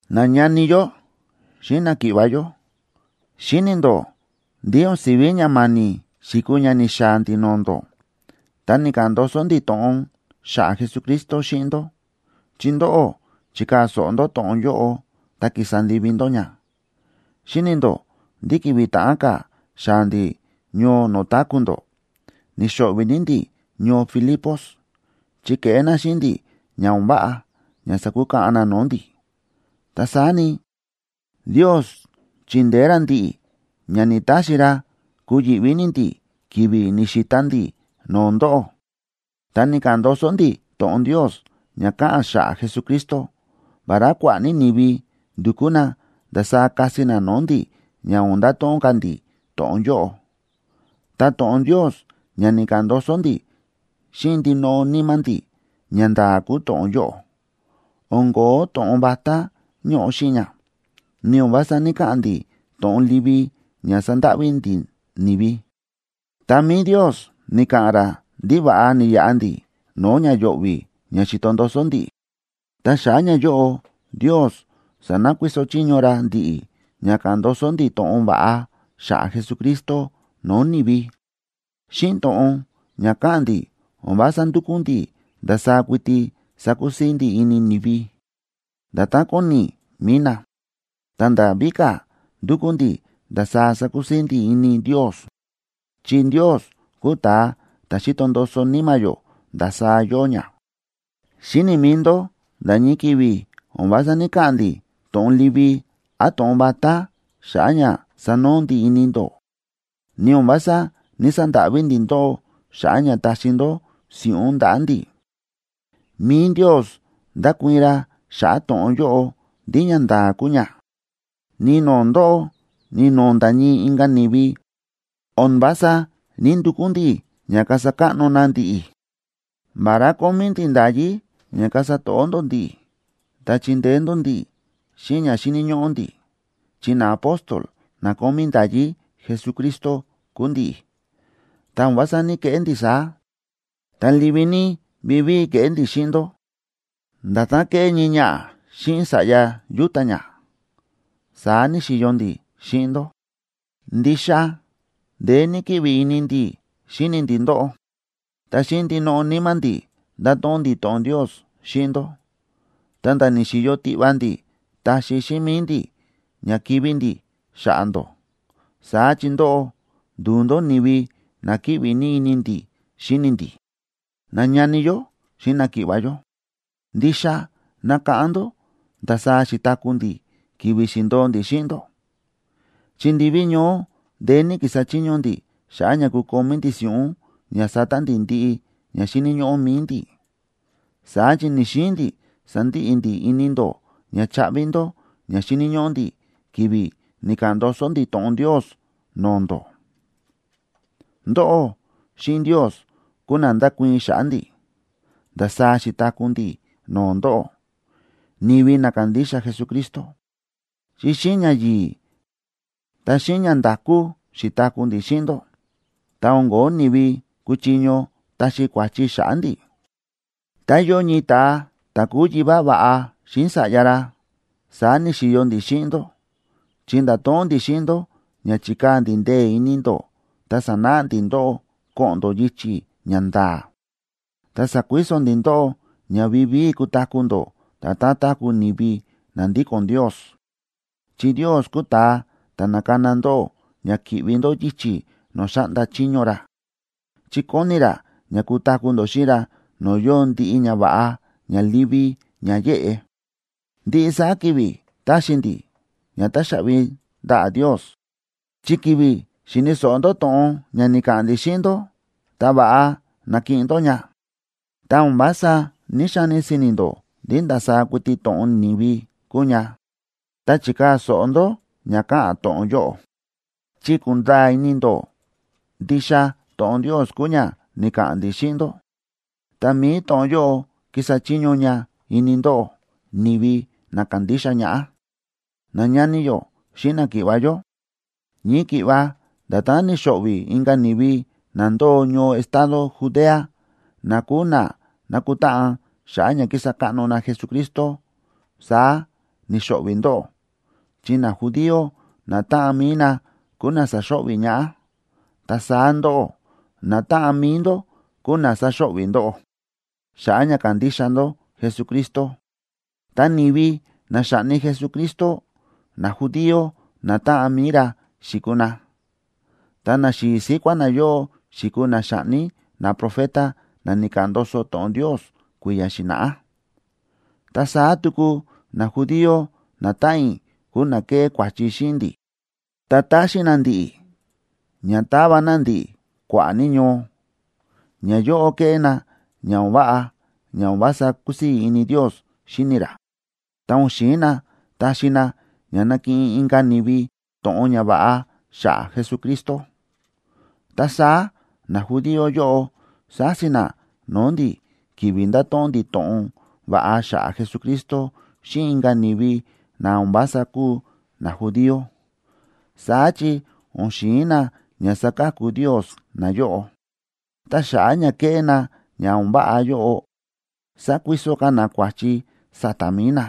Nañani yó xíꞌin náki̱ꞌva̱ yó, xíni̱ ndó ndí o̱n si̱ví ña ma̱ni̱ xi̱kuu ña ni̱xaa̱ ndi̱ no̱o̱ ndó ta ni̱ka̱ꞌa̱n ndoso ndi̱ to̱ꞌon xa̱ꞌa̱ Jesucristo xíꞌin ndó, chi ndóꞌó chi̱kaa̱ so̱ꞌo ndó to̱ꞌon yóꞌo ta kísa ndivi ndó ña. Xíni̱ ndó ndí ki̱vi̱ ta̱ꞌán ka̱ xaa̱ ndi̱ ñoo no̱o̱ táku̱ ndó, ni̱xo̱ꞌvi̱ ní ndi̱ ñoo Filipos, chi ke̱ꞌé na xíꞌin ndi̱ ña o̱n váꞌa ña sa̱kukaꞌan na no̱o̱ ndi̱. Ta saá ni, Ndios chi̱ndeé ra ndi̱ꞌi̱ ña ni̱‑taxi ra kuyi̱ꞌví ní ndi̱ ki̱vi̱ ni̱xita ndi̱ no̱o̱ ndóꞌó, ta ni̱ka̱ꞌa̱n ndoso ndi̱ to̱ꞌon Ndios ña káꞌa̱n xa̱ꞌa̱ Jesucristo, vará kua̱ꞌa̱ ní ni̱vi ndu̱kú na ndasaá kasi na no̱o̱ ndi̱ ña o̱n ndato̱ꞌon ka̱ ndi̱ to̱ꞌon yóꞌo. Ta to̱ꞌon Ndios ña ni̱ka̱ꞌa̱n ndoso ndi̱ xíꞌin ndinoꞌo níma̱ ndi̱, ñanda̱a̱ kúu to̱ꞌon yóꞌo, o̱n ko̱ó to̱ꞌon vatá ñóꞌo xíꞌin ña, ni o̱n vása ní‑kaꞌa̱n ndi̱ to̱ꞌon livi ña sandáꞌví ndi̱ ni̱vi. Ta mi̱i Ndios ni̱ka̱ꞌa̱n ra ndí va̱ꞌa ni̱yaꞌa ndi̱ no̱o̱ ña yo̱ꞌvi̱ ña xi̱to ndoso ndi̱ꞌi̱, ta xa̱ꞌa̱ ñayóꞌo Ndios sa̱nakuiso chiño ra ndi̱ꞌi̱ ña káꞌa̱n ndoso ndi̱ to̱ꞌon va̱ꞌa xa̱ꞌa̱ Jesucristo no̱o̱ ni̱vi. Xíꞌin to̱ꞌon ña káꞌa̱n ndi̱ o̱n vása ndúkú ndi̱ ndasaá kuiti sakusii̱ ndi̱ ini ni̱vi, nda̱tán kóni mi̱i na, ta nda̱ víka̱ ndúkú ndi̱ ndasaá sakusii̱ ndi̱ ini Ndios. Chi Ndios kúu ta̱a ta̱ xíto ndoso níma̱ yó ndasaá yóo ña. Xíni̱ mi̱i ndó nda̱ ñii ki̱vi̱ o̱n vása ní‑kaꞌa̱n ndi̱ to̱ꞌon livi án to̱ꞌon vatá xa̱ꞌa̱ ña sanoo ndi̱ ini ndó, ni o̱n vása ní‑sandáꞌví ndi̱ ndóꞌó xa̱ꞌa̱ ña taxi ndó si̱ꞌún ndaꞌa̱ ndi̱. Mi̱i Ndios ndákuii̱n ra xa̱ꞌa̱ to̱ꞌon yóꞌo ndí ñanda̱a̱ kúu ña. Ni no̱o̱ ndóꞌó, ni no̱o̱ nda̱ ñii inka̱ ni̱vi, o̱n vása ní‑ndukú ndi̱ ña kasa káꞌno na ndi̱ꞌi̱. Vará kómí ndi̱ nda̱yí ña kasa to̱ꞌó ndó ndi̱ꞌi̱, ta chindeé ndó ndi̱ꞌi̱ xíꞌin ña xíni̱ ñóꞌó ndi̱, chi naapóstola na kómí nda̱yí Jesucristo kúu ndi̱ꞌi̱, ta o̱n vása ní‑keꞌé ndi̱ saá. Ta livi ní vivíi ke̱ꞌé ndi̱ xíꞌin ndó, nda̱tán kéꞌé ñii ñaꞌa̱ xíꞌin sa̱ꞌya yúta̱ ñá, saá ni̱xi̱yo ndi̱ xíꞌin ndó. Ndixa ndeé ní kíꞌvi ini ndi̱ xíni ndi̱ ndóꞌó. Ta xíꞌin ndinoꞌo níma̱ ndi̱ nda̱to̱ꞌon ndi̱ to̱ꞌon Ndios xíꞌin ndó. Ta nda̱ ni̱xi̱yo tiꞌva ndi̱ taxi xíꞌin mi̱i ndi̱ ña kivi̱ ndi̱ xa̱ꞌa̱ ndó, saá chi ndóꞌó ndu̱u ndó ni̱vi na kíꞌvi ní ini ndi̱ xíni ndi̱. Nañani yó xíꞌin náki̱ꞌva̱ yó, ndixa nákáꞌán ndó ndasaá xi̱taku̱ ndi̱ ki̱vi̱ xi̱ndo̱o ndi̱ xíꞌin ndó, chi ndiví ñoó ndeé ní ki̱sa chiño ndi̱ xa̱ꞌa̱ ña kukomí ndi̱ si̱ꞌún ña sata ndi̱ ndiꞌi ña xíni̱ ñóꞌó mi̱i ndi̱. Saá chi ni̱‑xiin ndi̱ sandiꞌi ndi̱ ini ndó ña chaꞌvi ndó ña xíni̱ ñóꞌó ndi̱ ki̱vi̱ ni̱ka̱ꞌa̱n ndoso ndi̱ to̱ꞌon Ndios no̱o̱ ndó. Ndóꞌó xíꞌin Ndios kúu na ndákuii̱n xa̱ꞌa̱ ndi̱, ndasaá xi̱taku̱ ndi̱ no̱o̱ ndóꞌó, ni̱vi na kándixa Jesucristo, chi xíꞌin ñayi̱i̱, ta xíꞌin ñanda̱kú xi̱taku̱ ndi̱ xíꞌin ndó, ta o̱n ko̱ó ni̱vi kuchiño taxi kua̱chi xa̱ꞌa̱ ndi̱. Tá yóo ñii ta̱a ta̱ kúu yivá va̱ꞌa xíꞌin sa̱ꞌya ra, saá ni̱xi̱yo ndi̱ xíꞌin ndó, chi nda̱to̱ꞌon ndi̱ xíꞌin ndó ña chikaa̱ ndi̱ ndee̱ ini ndó ta sa̱náꞌa ndi̱ ndóꞌó ko̱ꞌo̱n ndó yichi̱ ña nda̱a̱. Ta sa̱kuiso ndi̱ ndóꞌó ña vivíi kutaku̱ ndó nda̱tán táku̱ ni̱vi na ndíko̱n Ndios, chi Ndios kúu ta̱a ta̱ na̱kana ndóꞌó ña ki̱ꞌvi ndó yichi̱ no̱o̱ xáꞌnda chiño ra, chi kóni ra ña kutaku̱ ndó xíꞌin ra no̱o̱ yóo ndiꞌi ñava̱ꞌa ña livi ña yéꞌe. Ndiꞌi saá ki̱vi̱ táxi ndi̱ ña táxaꞌvi ndaꞌa̱ Ndios, chi ki̱vi̱ xi̱ni̱ so̱ꞌo ndó to̱ꞌon ña ni̱ka̱ꞌa̱n ndi̱ xíꞌin ndó, ta va̱ꞌa na̱kiꞌin ndó ña. Ta o̱n vása ní‑xani si̱ni̱ ndó ndí ndasaá kuiti to̱ꞌon ni̱vi kúu ña, ta chi̱kaa̱ so̱ꞌo ndó ña káꞌa̱n to̱ꞌon yóꞌo, chi kúnda̱a̱ ini ndó ndixa to̱ꞌon Ndios kúu ña ni̱ka̱ꞌa̱n ndi̱ xíꞌin ndó, ta mi̱i to̱ꞌon yóꞌo kísa chiño ña ini ndóꞌó, ni̱vi na kándixa ñaꞌá. Nañani yó xíꞌin náki̱ꞌva̱ yó, ñii ki̱ꞌva nda̱tán ni̱xo̱ꞌvi̱ inka̱ ni̱vi na ndóo ñoo estado Judea, na kúu na nákutáꞌan xa̱ꞌa̱ ña kísa káꞌno na Jesucristo, saá ni̱xo̱ꞌvi̱ ndóꞌó. Chi najudío natáꞌan mi̱i na kúu na sa̱xo̱ꞌvi̱ ñaꞌá. Ta saá ndóꞌó, natáꞌan mi̱i ndó kúu na sa̱xo̱ꞌvi̱ ndóꞌó xa̱ꞌa̱ ña kándixa ndó Jesucristo. Ta ni̱vi na xa̱ꞌni Jesucristo, najudío natáꞌan mi̱i ra xi̱kuu na, ta naxi̱i̱ síkuá nayóꞌo xi̱kuu na xa̱ꞌni naprofeta na ni̱ka̱ꞌa̱n ndoso to̱ꞌon Ndios kui̱ya̱ xi̱na̱ꞌá. Ta saá tuku najudío natáꞌan i̱ kúu na ke̱ꞌé kua̱chi xíꞌin ndi̱, ta ta̱xin na ndi̱ꞌi̱ ña ta̱va na ndi̱ꞌi̱ kua̱ꞌa̱ ní ñoo. Nayóꞌo kéꞌé na ña o̱n váꞌa ña o̱n vása kúsii̱ ini Ndios xíni ra, ta o̱n xi̱in na taxi na ña nakiꞌin inka̱ ni̱vi to̱ꞌon ñava̱ꞌa xa̱ꞌa̱ Jesucristo. Ta saá najudío yóꞌo sási na no̱o̱ ndi̱ ki̱vi̱ ndáto̱ꞌon ndi̱ to̱ꞌon va̱ꞌa xa̱ꞌa̱ Jesucristo xíꞌin inka̱ ni̱vi na o̱n vása kúu najudío, saá chi o̱n xi̱in na ña saka̱ku Ndios nayóꞌo. Ta xa̱ꞌa̱ ña kéꞌé na ña o̱n váꞌa yóꞌo, sakuiso ka̱ na kua̱chi sa̱ta̱ mi̱i na,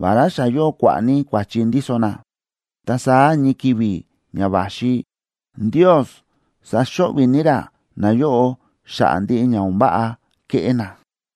vará xa yóo kua̱ꞌa̱ ní kua̱chi ndíso na. Ta saá ñii ki̱vi̱ ña va̱xi, Ndios saxo̱ꞌvi̱ ní ra nayóꞌo xa̱ꞌa̱ ndiꞌi ña o̱n váꞌa ke̱ꞌé na.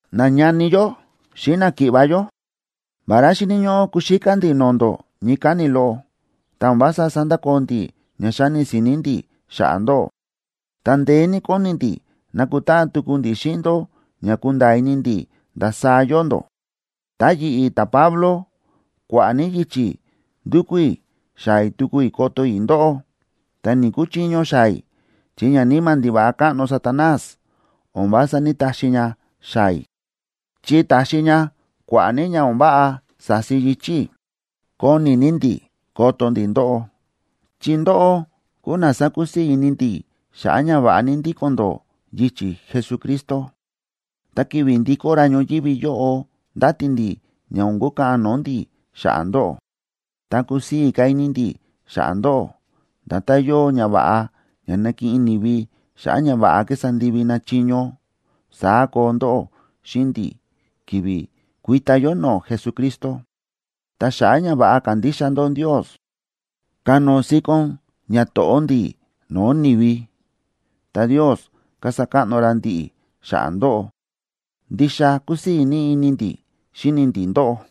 Nañani yó xíꞌin náki̱ꞌva̱ yó, vará xíni̱ ñóꞌó kuxíká ndi̱ no̱o̱ ndó ñii káni̱ loꞌo, ta o̱n vása sándakoo ndi̱ ña xáni si̱ni̱ ndi̱ xa̱ꞌa̱ ndóꞌó. Ta ndeé ní kóni ndi̱ nakutáꞌan tuku ndi̱ xíꞌin ndó ña kunda̱a̱ ini ndi̱ ndasaá yóo ndó. Ta yi̱ꞌi̱ ta̱Pablo, kua̱ꞌa̱ ní yichi̱ ndu̱kú i̱ xaa̱ i̱ tuku koto i̱ ndóꞌó, ta ni̱‑kuchiño xaa̱ i̱ chi ñaníma̱ ndiva̱ꞌa káꞌno Satanás o̱n vása ní‑taxi ña xaa̱ i̱, chi ta̱xi ña kua̱ꞌa̱ ní ña o̱n váꞌa sa̱si yichi̱ i̱. Kóni ní ndi̱ koto ndi̱ ndóꞌó, chi ndóꞌó kúu na sákusii̱ ini ndi̱ xa̱ꞌa̱ ña va̱ꞌa ní ndíko̱n ndó yichi̱ Jesucristo. Ta ki̱vi̱ ndikó ra ñoyívi yóꞌo, ndáti ndi̱ ña o̱n kukaꞌan no̱o̱ ndi̱ xa̱ꞌa̱ ndóꞌó, ta kusii̱ ka̱ ini ndi̱ xa̱ꞌa̱ ndóꞌó. Nda̱tán yóo ñava̱ꞌa ña nákiꞌin ni̱vi xa̱ꞌa̱ ña va̱ꞌa ki̱sa ndivi na chiño, saá koo ndóꞌó xíꞌin ndi̱ ki̱vi̱ kuita yó no̱o̱ Jesucristo. Ta xa̱ꞌa̱ ña va̱ꞌa kándixa ndó Ndios, kánóo síkón ñato̱ꞌó ndi̱ no̱o̱ ni̱vi, ta Ndios kasa káꞌno ra ndi̱ꞌi̱ xa̱ꞌa̱ ndóꞌó. Ndixa kúsii̱ ní ini ndi̱ xíni ndi̱ ndóꞌó.